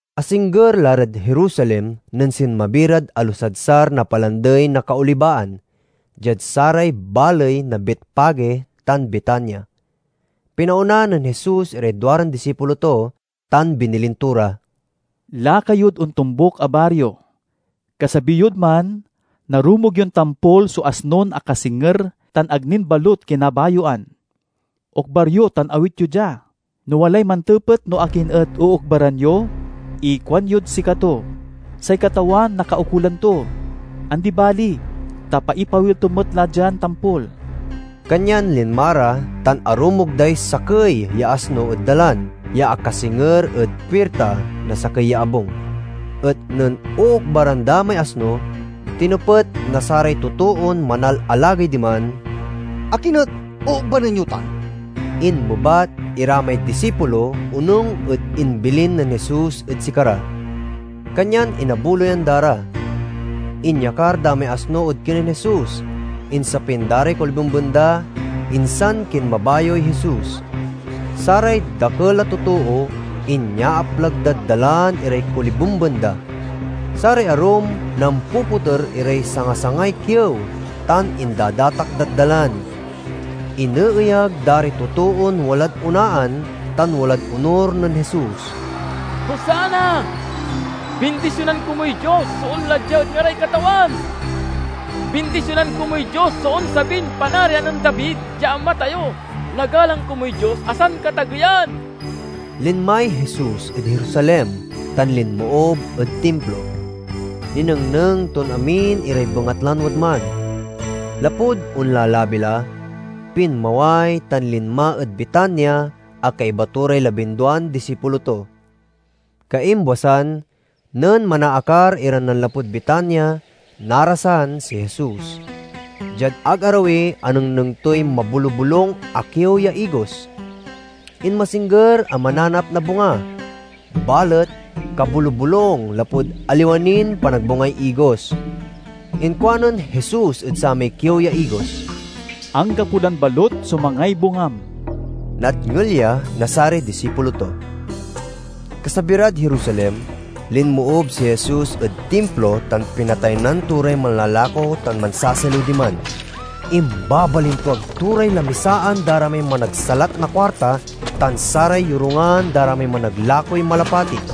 Asingger la rad Jerusalem nen sinmabi rad alusadsar na Palandey na Kaolibaan, diad saray baley na Betfage tan Betania. Pinaona nen Jesus iray duaran disipulo to, tan binilin to ra, "Laka yod ontombuk a bario. Kasabi yod man narumog yon tampol so asnon akasinger tan ag nin balut kinabayoan. Okbar yo tan awit yo dia. No walay mantepet no akin et ookbaran yo ikuanyod sikato, 'Say Katawan nakaukolan to. Andi bali, ta paipawil to met la dian tampol.'" Kanyan linma ra tan arumog day sakey ya asno ed dalan, ya akasinger ed puirta na sakey ya abung. Et nen ookbaran da may asno, tinepet na saray totoon manalalagey diman, "Akin et ookabaran yo tan?" Inmebat ira may disipulo, onung ed imbilin nen Jesus ed sikara, kanyan inabuloyan da ra. Inyakar da may asno ed kinen Jesus, insapin da ray kolibemben da, insan kinmabayoy Jesus. Saray dakel a totoo inyaaplag dad dalan iray kolibemben da. Saray arum nampopoter iray sangasangay kiew tan indadatak dad dalan. Ineeyag da ray totoon walad onaan tan walad onur nen Jesus, "Hosanna! Bindisionan komuy Dios so onla dia ed ngaray Katawan! Bindisionan komuy Dios so onsabin panarian nen David ya ama tayo! Nagalang komuy Dios a Sankatageyan!" Linmay Jesus ed Jerusalem tan linmoob ed Timplo. Ninengneng ton amin iray bengatlan wadman. Lapud onlalabi la, pinmaway tan linma ed Betania a kaiba to ray labinduan disipulo to. Kaimbwasan, nen manaakar iran nanlapud Betania, narasan si Jesus. Diad ag arawi anengneng toy mabolubolung a kiew ya igos. Inmasingger a mananap na bunga, balet kabolubolung lapud aliwa nin panagbungay igos. Inkuanen Jesus ed samay kiew ya igos, "Anggapo lan balut so mangay bungam!" Nadngel ya na saray disipulo to. Kasabi rad Jerusalem linmoob si Jesus ed Timplo tan pinataynan to ray manlalako tan mansasaliw diman. Imbabalintuag to ray lamisaan da ray managsalat na kuarta tan saray yorungan da ray managlakoy malapati,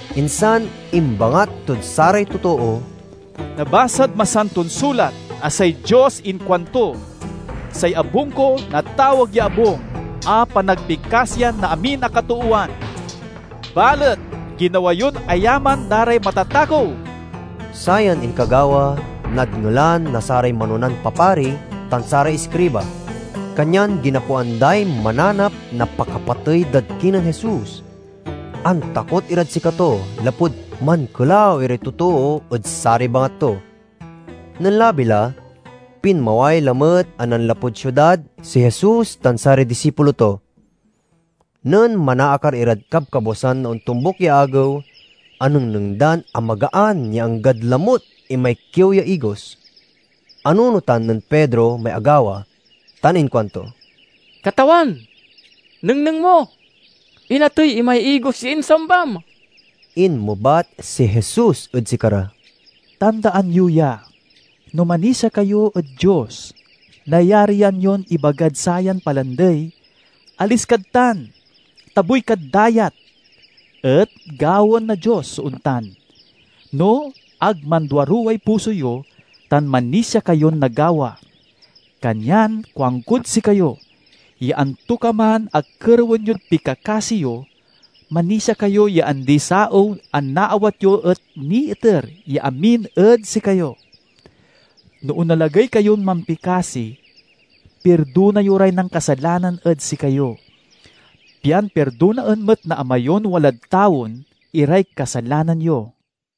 Insan imbangat tod saray totoo, "Nabasad Masanton Sulat a say Dios inkuanto, 'Say abung ko natawag ya abung a panagpikasiyan na amin a katoowan.' Balet ginawa yon ayaman da ray matatakew!" Sayan inkagawa nadngelan na saray manonan papari tan saray iskriba, kanyan ginapoan day mananap na pakapatey dad kinen Jesus. Antakot irad sikato lapud mankelaw iray totoo ed saray bangat to. Nen labi la, pinmaway lamet a nanlapud siudad si Jesus tan saray disipulo to. Nen manaakar irad kabkabwasan na ontombuk ya agew, anengneng dan amagaan ya anggad lamut imay kiew ya igos. Anunotan nen Pedro may agawa tan inkuanto, "Katawan, nengneng mo, inatey imay igos ya insambam!" Inmebat si Jesus ed sikara, "Tandaan yo ya! No manisia kayo ed Dios, nayarian yon ibagd sayan palandey, 'Alis kad tan, tabuy kad dayat,' et gawaen na Dios so ontan, no ag manduaruway puso yo tan manisia kayon nagawa. Kanyan kuankod sikayo ya antokaman a kerewen yod pikakasi yo, manisia kayo ya andi-saew a naawat yo et niiter ya amin ed sikayo. No onalagey kayon mampikasi, pirdona yo ray nankasalanan ed sikayo, pian pirdonaen met na Ama yon walad tawen iray kasalanan yo."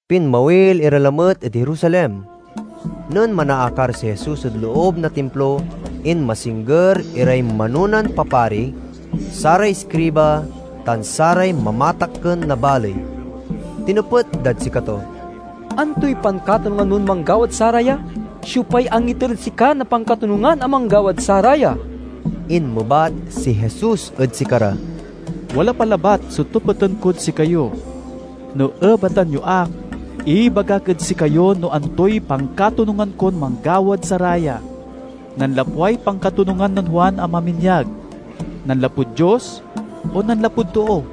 Pinmawil ira lamet ed Jerusalem. Nen manaakar si Jesus ed loob na Timplo, inmasingger iray manonan papari, saray iskriba, tan saray mamatakken na baley. Tinepet dad sikato, "Antoy pankatonungan mon manggawad saraya? Siopay angiter ed sika na pankatonungan a manggawad saraya?" Inmebat si Jesus ed sikara, "Wala pa labat so tepeten kod sikayo. No ebatan yo ak, ibagak ed sikayo no antoy pankatonungan kon manggawad saraya. Nanlapway pankatonungan nen Juan a maminyag: nanlapud Dios o nanlapud too?"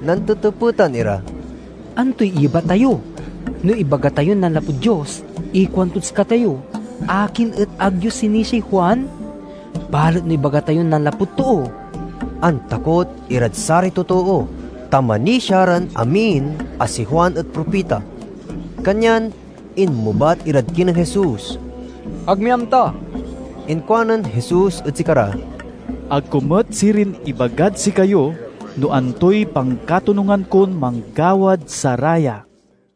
Nantetepetan ira, "Antoy iyebat tayo? No ibaga tayon nanlapud Dios, ikuantod sikatayo, 'Akin et ag yo sinisiay Juan?' Balet no ibaga tayon nanlapud too..." (Antakot irad saray totoo, tan manisia ran amin a si Juan et propita.) Kanyan inmebat irad kinen Jesus, "Ag mi amta." Inkuanen Jesus ed sikara, "Ag ko met sirin ibagad sikayo no antoy pankatonungan kon manggawad saraya."